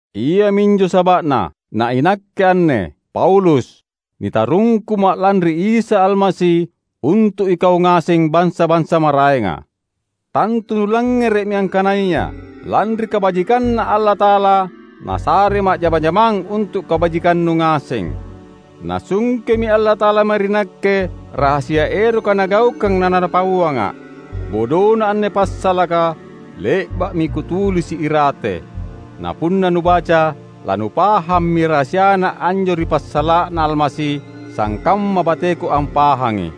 Iaminjo saba’na, na inakke anne, Paulus, nitarungkuma’ lanri Isa Almasi untu’ ikau ngaseng bansa-bansa maraenga. Tantu nulangngere’mi, angkanaya, lanri kabajikanNa Allata’ala Nasarema’ jama-jamang untu’ kabajikannu ngaseng. Nasungkemi Allata’ala mae ri nakke rahasia eroka Nagaukang na Napauanga’. (Bodona anne passalaka le’ba’mi kutulisi’ irate; na punna nubaca, lanupahammi rahasiana anjo ri passala’na Almasi, sangkamma bateku ampahangi.)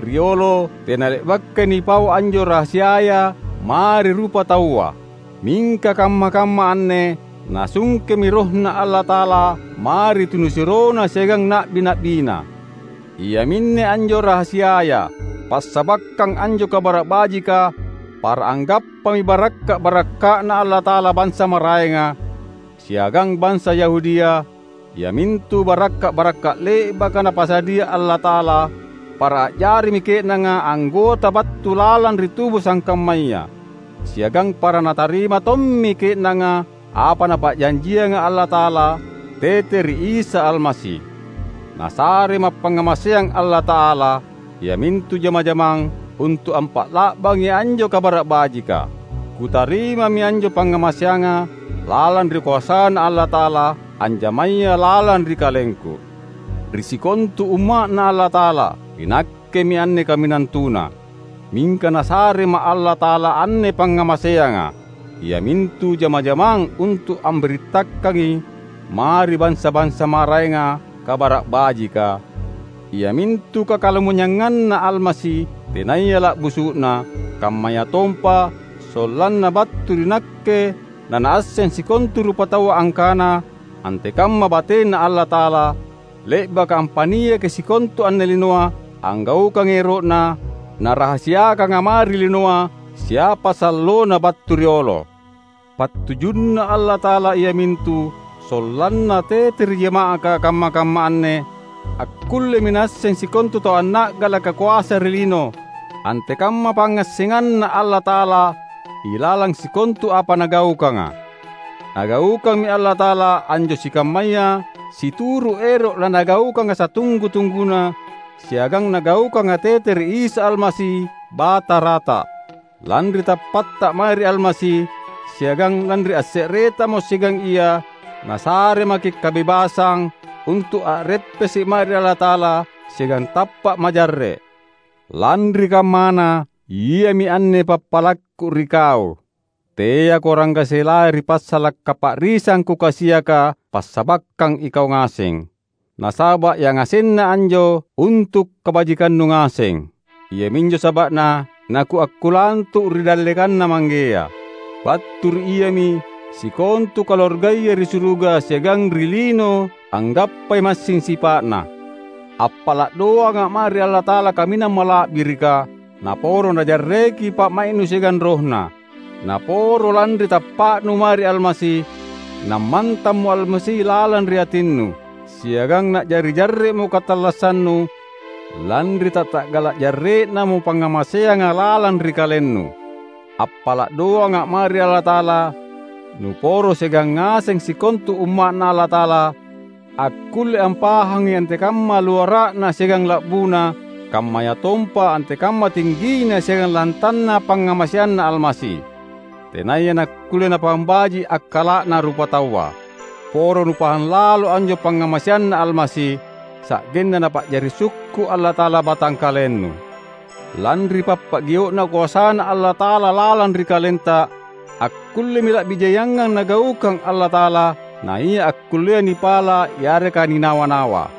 Riolo tena le’bakai nipau anjo rahasiaya mae ri rupataua; mingka kamma-kamma anne Nasungkemi RohNa Allata’ala mae ri tunisuroNa siagang na’bi-na’biNa. Iaminne anjo rahasiaya: Passabakkang anjo Kabara’ Bajika, para anggappami barakka’-barakka’Na Allata’ala bansa maraenga, siagang bansa Yahudia, iamintu barakka’-barakka’ le’baka Napasadia Allata’ala; para a’jarimi ke’nanga anggota battu lalang ri tubu sangkammaya, siagang para natarima tommi ke’nanga apa Napa’janjianga Allata’ala tete ri Isa Almasi. Nasarema’ pangngamaseang Allata’ala, iamintu jama-jamang, untu’ ampa’la’bangi anjo Kabara’ Bajika. Kutarimami anjo pangngamaseanga lalang ri koasaNa Allata’ala, anjamaya lalang ri kalengku. Ri sikontu umma’Na Allata’ala, inakkemi anne kaminang tuna. Mingka Nasarema’ Allata’ala anne pangngamaseanga: Iamintu jama-jamang untu’ ambirittakangi mae ri bansa-bansa maraenga Kabara’ Bajika, iamintu kakalumanynyanganNa Almasi tenaya la’busu’na; kammayatompa sollanna battu ri nakke nanaasseng sikontu rupataua angkana antekamma bateNa Allata’ala, — le’baka ampa’niaki sikontu anne linoa — anggaukangi ero’Na, Narahasiakanga mae ri linoa siapa sallona battu riolo. PattujunNa Allata’ala iamintu sollanna tete ri jama’aka kamma-kamma anne, akkullemi naasseng sikontu tau anna’galaka koasa ri lino, antekamma pangngassenganNa Allata’ala ilalang sikontu apa Nagaukanga. Nagaukammi Allata’ala anjo sikammaya situru’ ero’ laNagaukanga satunggu-tungguna, siagang Nagaukanga tete ri Isa Almasi, Batarata. Lanri tappatta mae ri Almasi, siagang lanri asse’retamo siagang Ia, Nasaremaki’ kabebasang untu’ a’reppese’ mae ri Allata’ala siagang tappa’ majarre’. Lanri kammana, iami anne pappalakku ri kau: teako ranggaselai ri passala’ kapa’risang kukasiaka passabakkang ikau ngaseng; nasaba’ yangasenna anjo untu’ kabajikannu ngaseng. Iaminjo saba’na nakuakkulantu’ ri dallekanNa Manggea. Battu ri Iami sikontu kaluargaya ri suruga siagang ri lino anggappai massing sipa’Na. Appala’ doanga’ mae ri Allata’ala kaminang mala’birika naporo Najarreki pa’mai’nu siagang RohNa. Naporo lanri tappa’nu mae ri Almasi, nammantammo Almasi lalang ri atinnu; siagang na’jari jarre’mo katallassannu lanri tatta’gala’ jarre’namo pangngamaseanga lalang ri kalennu. Appala’ doanga’ mae ri Allata’ala nuporo siagang ngaseng sikontu Umma’Na Allata’ala, akkulle ampahangi antekamma luara’na siagang la’buna, kammayatompa antekamma tinggina siagang lantanna pangngamaseanNa Almasi, tenaya nakkulle napahang baji’ akkala’na rupataua. Poro nupahang lalo anjo pangngamaseanNa Almasi, sa’genna Napa’jari sukku’ Allata’ala batangkalennu. Lanri pappagio’na koasaNa Allata’ala lalang ri kalenta, akkullemi la’bi jaiangang Nagaukang Allata’ala, naia akkullea nipala’ yareka ninawa-nawa.